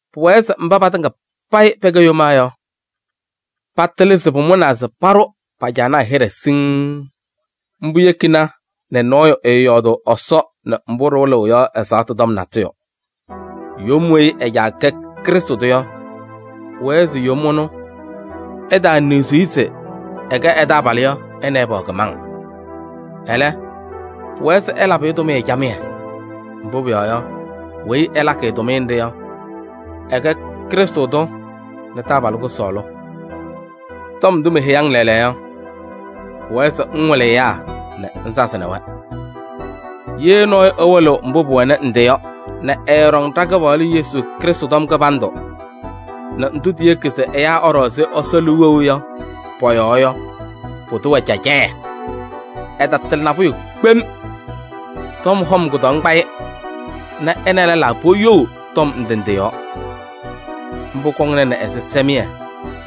Pʋwɛɛ se mba patɩŋa payɩ pɛkɛ yomaa yɔ, patɩlɩ se pʋmʋnaa se paɖʋ pa-caanaa hɩɖɛ siŋŋ. Mbʋ yekina nɛ nɔɔyʋ ɛɛyɔɔdʋʋ Ɛsɔ nɛ mbʋ ɖɩwɩlɩɣ yɔ ɛzaɣtʋ tɔm natʋyʋ. Yom weyi ɛ-caa kɛ Krɩstʋ tʋ yɔ, pʋwɛɛ se yom ɛnʋ, ɛtaaniɣzi-i se ɛkɛ ɛ-taabalʋ yɔ, ɛ nɛ ɩ pɛwɛ kɩmaŋ. Ɛlɛ, pʋwɛɛ se ɛlabɩ-ɩ tʋmɩyɛ camɩyɛ. Mbʋ pʋyɔɔ yɔ, weyi ɛlakɩ-ɩ tʋmɩyɛ nɖɩ yɔ, ɛkɛ Krɩstʋ tʋ nɛ taabalʋ kʋsɔɔlʋ. Cɛtɩm tɔm wɩlɩyaa tɔm Tɔm ndʋ meheyi-ŋ lɛɛlɛɛyɔ yɔ, pʋwɛɛ se ŋwɩlɩ ɛyaa nɛ ŋsazɩnɩ-wɛ. Ye nɔɔyʋ ɛwɩlɩɣ mbʋ pʋwɛnɩ ndɩ yɔ nɛ ɛɛɖɔŋ ɖa-Kɩpaɣlʋ Yesu Krɩstʋ tɔm kɩbandʋ nɛ ndʋ tiyeki se ɛyaa ɛɖɔ ɛzɩ Ɛsɔ liu wɛʋ yɔ pɔ-yɔɔ yɔ, pʋdʋ wɛ cacɛyɛ. Ɛtatɩlɩ nabʋyʋ kpem. Tɔm hɔm kʋdɔŋ kpa-ɩ nɛ ɛ nɛ lɛlaa poyou tɔm ndɩ ndɩ yɔɔ. Mbʋ kɔŋnɩnɩ ɛzɩsɛmɩyɛ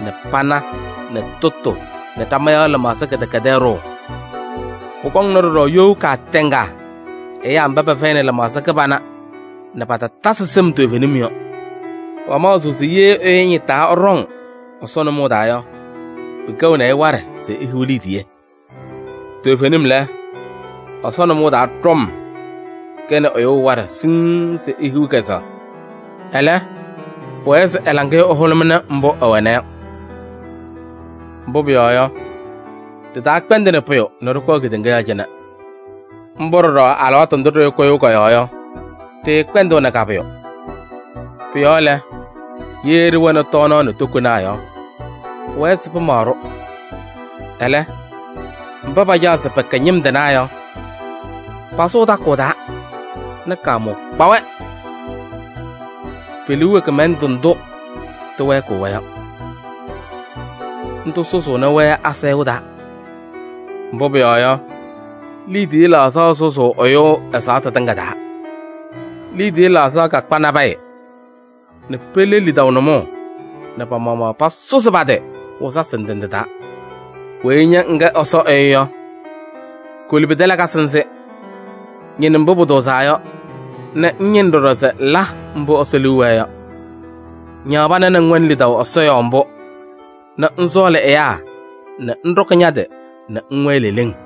nɛ pana nɛ tʋtʋ nɛ ɖama yɔɔ lɩmaɣza kɩdɛkɛdɛɛ ɖʋʋ. Pʋkɔŋnɩ ɖɔɖɔ you kaatɛŋa ɛyaa mba pɛfɛyɩnɩ lɩmaɣza kɩbana nɛ patatasɩ sɩm toovenim yɔ. Pamaɣzɩɣ se ye ɛyʋ ɛñɩtaa ɛɖɔŋ Ɛsɔ nʋmɔʋ taa yɔ, pɩkɛɣnɩ-ɩ waɖɛ se ehiɣ liidiye. Toovenim lɛ, Ɛsɔ nʋmɔʋ taa ɖɔm kɛnɩ ɛyʋ waɖɛ siŋŋ se ehiɣ kɛzɛɣ. Ɛlɛ, pʋwɛɛ se ɛ-laŋɩyɛ ɛhʋlʋmɩnɩ mbʋ ɛwɛna yɔ. Mbʋ pʋyɔɔ yɔ, ɖɩtaakpɛndɩnɩ pʋyʋ nɛ ɖɩkɔɔ kedeŋa yɔɔ cɩnɛ. Mbʋ ɖɔɖɔ alɩwaatʋ ndʋ ɖɩkʋyʋʋ kɔ-yɔɔ yɔ, ɖɩɩkpɛndɩɣnɩ ka-pʋyʋ. Pʋ-yɔɔ lɛ, ye ɖɩwɛnɩ tɔɔnaɣ nɛ tokonaa yɔ, pʋwɛɛ se pɩmaɣ-ɖʋ. Ɛlɛ, mba pacaɣ se pɛkɛ ñɩm tɩnaa yɔ, pasʋʋ takʋʋ taa nɛ kaamʋʋ kpa-wɛ. Pe-liu wɛ kɩmɛlɛndʋ ndʋ tɩwɛɛkɩɣ-wɛ yɔ. Ndʋ sʋzʋʋnɩ-wɛ asayʋʋ taa. Mbʋ pʋyɔɔ yɔ, liidiye laɣzaɣ sʋzʋʋ ɛyʋ ɛzaɣtʋ tɩŋa taa. Liidiye laɣzaɣ kakpa nabɛyɛ nɛ pele lidaʋ nʋmɔʋ nɛ pa-maɣmaɣ pasʋzɩ pa-tɩ wɩzasɩ ndɩ ndɩ taa. Weyi ña ŋkɛ Ɛsɔ ɛyʋ yɔ, koli pɩtɛ lakasɩ nzɩ. Ñɩnɩ mbʋ pʋtʋʋzaa yɔ nɛ ŋñɩnɩ ɖɔɖɔ se ŋla mbʋ Ɛsɔ liu wɛɛ yɔ. Ñaɣ pana nɛ ŋwɛnɩ lidaʋ Ɛsɔ yɔɔ mbʋ nɛ ŋsɔɔlɩ ɛyaa nɛ ŋɖɔkɩ ña-tɩ nɛ ŋwɛɛ leleŋ.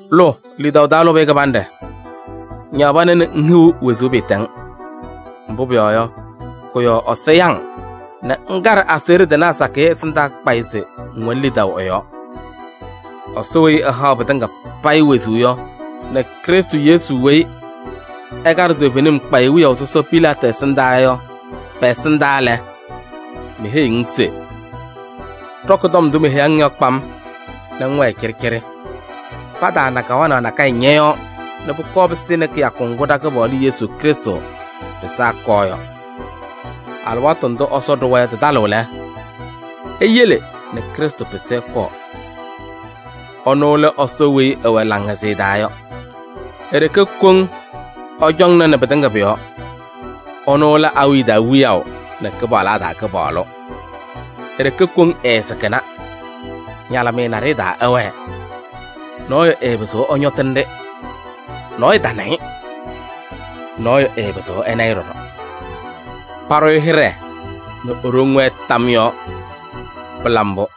Lʋ lidaʋ taa lʋbɩyɛ kɩbanɖɛ. Ñaɣ pana nɛ ŋhiɣ wezuu pɩɩtɛŋ. Mbʋ pʋyɔɔ yɔ, kʋ-yɔɔ Ɛsɔ ya-ŋ nɛ ŋkaɖɩ aseɣɖe tɩnaa sakɩyɛ ɛsɩndaa kpayɩ se ŋwɛnɩ lidaʋ ɛ-yɔɔ. Ɛsɔ weyi ɛhaɣ pɩtɩŋa payɩ wezuu yɔ nɛ Krɩstʋ Yesu weyi ɛkaɖɩ toovenim kpayɩ wiyaʋ sɔsɔ Pilaatɩ ɛsɩndaa yɔ pɛ-ɛsɩndaa lɛ, meheyiɣ-ŋ se: ɖɔkɩ tɔm ndʋ meheyi-ŋ yɔ kpam nɛ ŋwɛɛ cɩɖɩcɩɖɩ. Pataana kawanaɣ nakɛyɛ ñɔ-yɔɔ nɛ pʋkɔɔ pɩsɩnɩ kɩyakʋ ŋgʋ ɖa-Kɩpaɣlʋ Yesu Krɩstʋ pɩsaa ɛkɔɔ yɔ. Alɩwaatʋ ndʋ Ɛsɔ ɖʋwa yɔ tɩtalɩɣ lɛ, eyele nɛ Krɩstʋ pɩsɩ ɛkɔɔ. Ɛnʋ lɛ Ɛsɔ weyi ɛwɛ laŋhɛzɩyɛ taa yɔ. E-ɖeke koŋ ɛcɔŋnɩnɩ pɩtɩŋa pʋ-yɔɔ. Ɛnʋ lɛ awiya taa Wiyaʋ nɛ kɩpaɣlaa taa Kɩpaɣlʋ. E-ɖeke koŋ ɛɛsɩkɩna, ñalɩmɩyɛ naɖɩyɛ taa ɛwɛɛ. Nɔɔyʋ ɛɛpɩzɩɣ ɛñɔtɩnɩ-ɖɩ. Nɔɔyʋ tana-ɩ, nɔɔyʋ ɛɛpɩzɩɣ ɛna-ɩ ɖɔɖɔ. Paɖʋ-ɩ hɩɖɛ nɛ e-ɖoŋ wɛɛ tam yɔɔ! Pɩla mbʋ.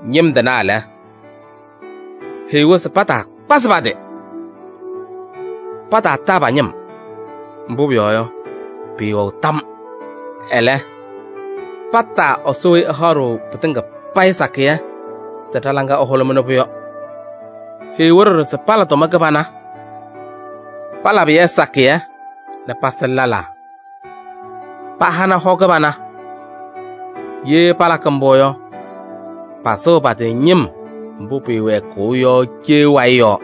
Ñɩm tɩnaa lɛ, heyi-wɛ se pataakpazɩ pa-tɩ. Pataataa pa-ñɩm, mbʋ pʋyɔɔ yɔ, pɩɩwɛɣ tam. Ɛlɛ, pataa Ɛsɔ weyi ɛhaɣ-ɖʋ pɩtɩŋa payɩ sakɩyɛ se ɖa-laŋa ɛhʋlʋmɩnɩ-pʋ yɔ. Heyi-wɛ ɖɔɖɔ se pala tʋma kɩbana. Palabɩ-yɛ sakɩyɛ nɛ pasɩnɩ lɛlaa, pahanɩ hɔ kɩbana. Ye palakɩ mbʋ yɔ, pasɩɣ pa-tɩ ñɩm mbʋ pɩɩwɛɛkɩɣ yɔ cee wayɩ yɔɔ.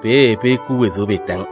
Peeye pehikiɣ wezuu pɩɩtɛŋ.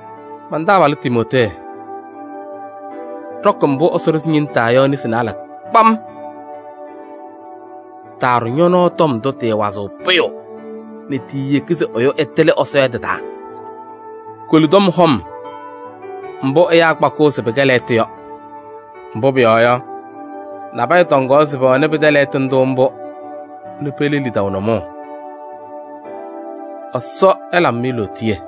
Man-taabalʋ Timootee, ɖɔkɩ mbʋ Ɛsɔ ɖʋzɩ ñe-nesi taa yɔ nesi naalɛ kpam. Taaɖʋ ñɔ-nɔɔ tɔm ndʋ tɩɩwazɩɣ pʋyʋ nɛ tiiyeki se ɛyʋ ɛtɩlɩ Ɛsɔ yɔ tɩ-taa. Koli tɔm hɔm mbʋ ɛyaa kpakɩɣ se pɩkɛ lɛɣtʋ yɔ. Mbʋ pʋyɔɔ yɔ, nabɛyɛ tɔŋaɣ se pɛwɛnɩ pɩtɛ lɛɣtʋ ndʋ mbʋ nɛ pele lidaʋ nʋmɔʋ. Ɛsɔ ɛlabɩ-mɩ lootiye.